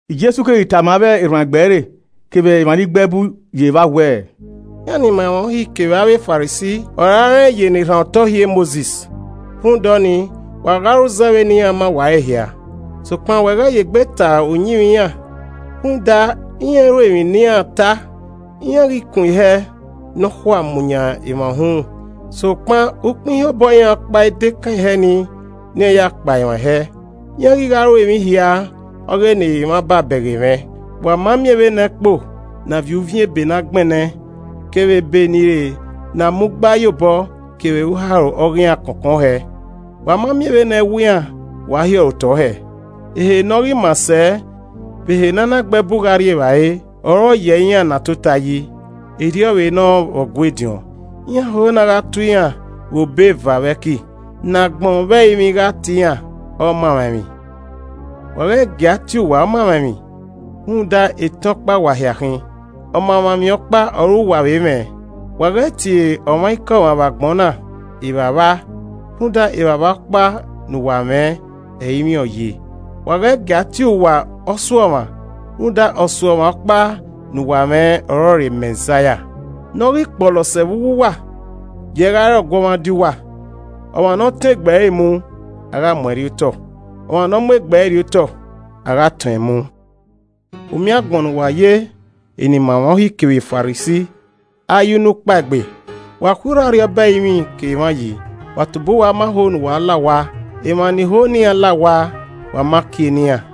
Jesu keghi tama avbe erhuanegbe ẹre kevbe emwa ni gbe ẹbu ye evba wẹẹ, “Iran ni ma emwa Uhi kevbe avbe Farisi ọre a rẹn ye ni rhan otọ uhi e Mosis. Rhunmwuda ọnii, wa gha ru zẹ vbene iran ma uwa ẹre hia, sokpan wa ghẹ ye egbe ta uyimwẹ iran rhunmwuda, iran i ru emwi ne iran ta. Iran ghi kun ihẹ ne ọ khuaa mu yan emwa uhunmwu sokpan ukpẹ ihen obọ iran ọkpa i dekan ihẹ nii ne iran ya kpa emwa ihẹ. Iran ghi gha ru emwi hia ọghe ne emwa ba bẹghe mwẹ. Wa ma miẹn vbene ẹkpo ne a viọ uviẹn ebe na gbẹnnẹ kevbe Ebe ni re na a mu gba ye obọ kevbe uharo ọghe iran kọnkọn hẹẹ! Wa ma miẹn vbene ẹwu iran wa hiọrọ otọ hẹẹ! Ehe ne ọ ghi maa sẹ vbe ehe ne a na ghe ẹbu gha rri evbare, ọre ọ yẹ iran ne a tota yi, erriọ vbe nọ vbe Ọgua ediọn. Iran ho ne a gha tuẹ iran vbe obọ eva vbe ẹki, ne agbọn vbe ẹrinmwi gha tie iran ‘Ọmamwaemwi.’ Wa ghẹ gie a gha tie uwa ‘Ọmamwaemwi’ rhunmwuda etẹn ọkpa wa hia khin, Ọmamwaemwi ọkpa ọre uwa vbe mwẹ. Wa ghẹ tie ọmwaikọmwa vbe agbọn na ‘Evbavba’ rhunmwuda Evbavba ọkpa ne uwa mwẹ, ẹrinmwi ọre ọ ye. Wa ghẹ gie a tie uwa ‘Ọsuọmwa’ rhunmwuda Ọsuọmwa ọkpa ne uwa mwẹ ọrọre Mẹzaia. Ne ọ ghi kpọlọ sẹ vbe uwu wa, gie ẹe gha re ọguọmwadia uwa. Ọmwa ne ọ tọn egbe ẹre mu, a gha mu ẹn rriotọ, ọmwa ne ọ mu egbe ẹre rriotọ, a gha tọn ẹn mu. “U miẹn agbọn ne uwa ye eni ma emwa Uhi kevbe Farisi, ayunukpaegbe! Wa khui urho Arriọba ẹrinmwi ke emwa yi, wa tobọ uwa ma ho ne uwa la owa, emwa ni ho ne iran la owa, wa ma kie ne iran. [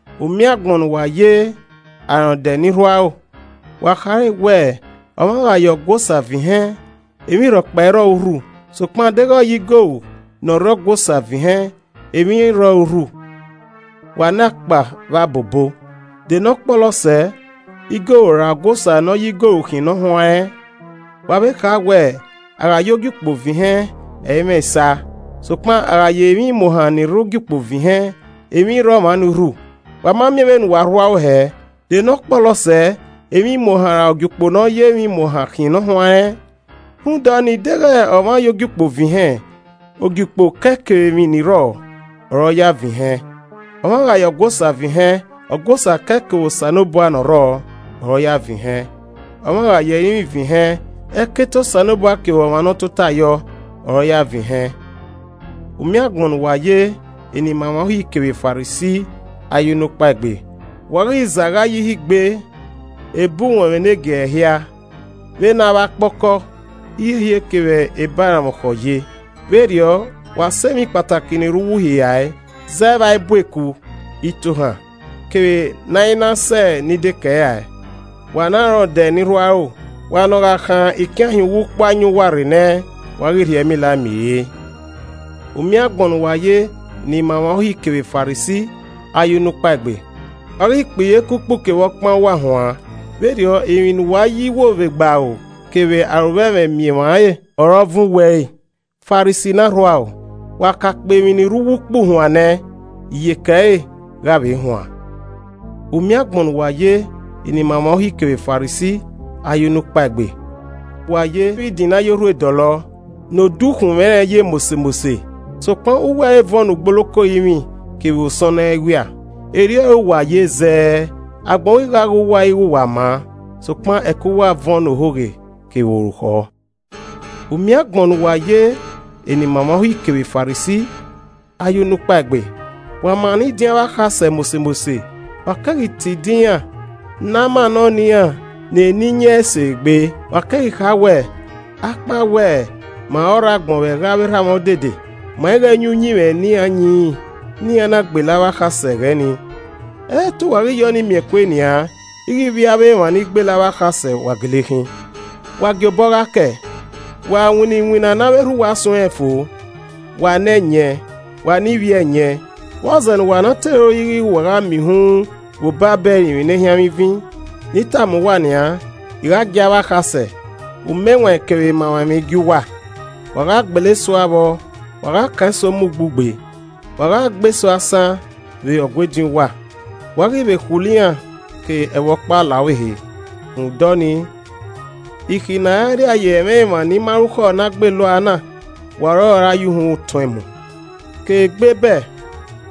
“U miẹn agbọn ne uwa ye arọndẹ ni rhu aro, wa khare wẹẹ, ‘Ọmwa gha ye Ọgua Osa vẹn ihẹn, emwi rhọkpa i rrọ ẹre urhu sokpan deghẹ ọ ye igoru ne ọ rre Ọgua Osa vẹn ihẹn, emwi rre ọre urhu.’ Wa ne akpa vbe abobo! De ne ọkpọlọ sẹ, igoru ra Ọgua Osa ne ọ ya igoru khian ne ọ huanrẹn? Wa vbe kha wẹẹ, ‘A gha ya Ogiukpo vẹn ihẹn, ẹ i mwẹ esa, sokpan, a gha ya emwi imuohan ni rre Ogiukpo vẹn ihẹn, emwi rre ọmwa ni urhu.’ Wa ma miẹn vbe ne uwa rhu aro hẹ. De ne ọ kpọlọ sẹẹ, emwi imuohan, ra Ogiukpo ne ọ ya emwi imuohan khian ni huanrẹn? Rhunmwuda ọnii, deghẹ ọmwa ya Ogiukpo vẹn ihẹn, Ogiukpo kẹe kevbe emwi ni rrọọ, ọre ọ ya vẹn ihẹn. Ọmwa gha ya Ọgua Osa vẹn ihẹn, Ọgua Osa kẹe kevbe Osanobua ne ọ rrọọ, ọre ọ ya vẹn ihẹn. Ọmwa gha ya ẹrinmwi vẹn ihẹn, ẹkete Osanobua kevbe ọmwa ne ọ tota yọ, ọre ọ ya vẹn ihẹn. “U miẹn agbọn ne uwa ye, enimaemwa Uhi kevbe Farisi, ayunukpaegbe. Wa ghi zẹ a ghae ye ihe igbe ebe uwọnmwẹ ne giẹrẹ hia, vbe ne avbe akpọkọ, ihiehie kevbe ebe aranmwọkhọ ye, vberriọ, wa sẹ emwi kpataki ni rre uwu Uhi rae, zẹ vbe a i bu eku, itohan, kevbe ne a i na sẹ ni dekẹe rae. Wa ne arọndẹ ni rhu aro, wa ne ọ gha khan ikian hin uwu ukpu ayọn uwa rre nẹ, wa ghi rhie ẹmila mi re! “U miẹn agbọn ne uwa ye enimaemwa Uhi kevbe Farisi ayunukpaegbe! Wa ghi kpe iyeke ukpu kevbe ọkpan uwa huan, vberriọ emwi ne uwa ye iwo vbe egbe aro kevbe arovbẹmwẹ miẹn emwa re ọre ọ vuọn uwa ẹre. Farisi ne arhu aro, wa ka kpe emwi ni rre uwu ukpu huan nẹ, iyeke ẹre gha vbe huan. “U miẹn agbọn ne uwa ye, enimaemwa Uhi kevbe Farisi, ayunukpaegbe! Wa ye vbe idin ne a ye orhue dọlọ, ne odukhunmwu ẹnrẹn ye mose mose, sokpan uwu ẹre vuọn ne ugboloko orinmwi kevbe osọnnọ ẹwia. Erriọ ọre uwa ye zẹẹ, agbọn ghi gha ghe uwa ighẹ uwa maa, sokpan ẹko uwa vuọn ne ohoghe kevbe orukhọ. “U miẹn agbọn ne uwa ye enimaemwa Uhi kevbe Farisi, ayunukpaegbe. Wa mannọ idin avbe akhasẹ mose mose, wa keghi te idin ne a mannọ ne iran ne eni yin ẹse egbe. Wa keghi kha wẹẹ, ‘Akpawẹ ma ọre ọ rre agbọn vbe ẹghẹ avbe erha mwa odede, ma ighẹ yin uyinmwẹ ne iran yinrin ne iran na gbele avbe akhasẹ ẹghẹ ni.’ Ẹ i re te uwa ghi ya ọnii miẹn kue nian ighẹ ivbi avbe emwa ni gbele avbe akhasẹ wa gele khin! Wa gie obọ gha kẹe, wa winna iwinna ne avbe erha uwa suẹnrẹn fo. Wa ne ẹyẹn, wa ne ivbi ẹyẹn, vbọzẹ ne uwa na te ro yi ighẹ wa gha miẹn uhunmwu vbe obọ abe ẹrinmwi ne ehianmwẹ ivin? Ne I tama uwa nian: I gha gie avbe akhasẹ, umẹwaẹn kevbe emamwaemwi gie uwa. Wa gha gbele eso ua vbọ, wa gha kan eso mu ugbugbe, wa gha gbe eso asan vbe Ọgua ediọn uwa, wa ghi vbe khulo iran ke ẹvbo ọkpa la ọvbehe. Rhunmwuda ọnii, ikhi ne a ra rria ye ẹmwẹ emwa ni ma rukhọ ne a gbele ua na, wa ọre ọ ra ya uhunmwu tọn ẹn mu. Ke egbe Ebel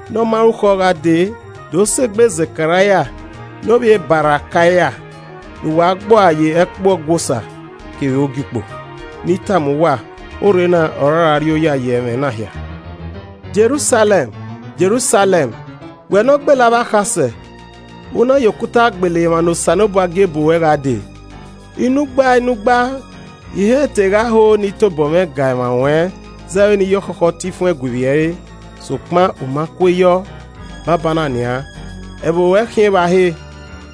ne ọ ma rukhọ gha dee do sẹ egbe Zekaraia ne ovbi e Barakaia, ne uwa gbe ua ye ẹkpo Ọgua Osa kevbe ogiukpo. Ne I tama uwa, orre na ọre ọ ra rrioya ye ẹmwẹ na hia! “Jerusalẹm, Jerusalẹm, wẹ ne ọ gbele avbe akhasẹ, u na vbe ye okuta gbele emwa ne Osanobua gie bu ruẹ gha dee! Inugba inugba I he te gha ho ne I tan obọ mwẹ ga emwa ruẹn zẹ vbene iye ọkhọkhọ tan ifuẹn gue ivbi ẹre, sokpan, u ma kue yọ. Banbanna nian, ẹvbo ruẹ khian evba he!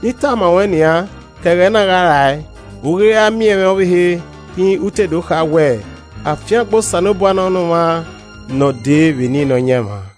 Ne I tama ruẹn nian, ke ẹghẹ na gha rae, u i ghi ra miẹn mwẹ ọvbehe rhinrin u te do kha wẹẹ, ‘Afiangbe Osanobua nọ ne ọmwa ne ọ dee vbe eni Nọyaẹnmwa.’”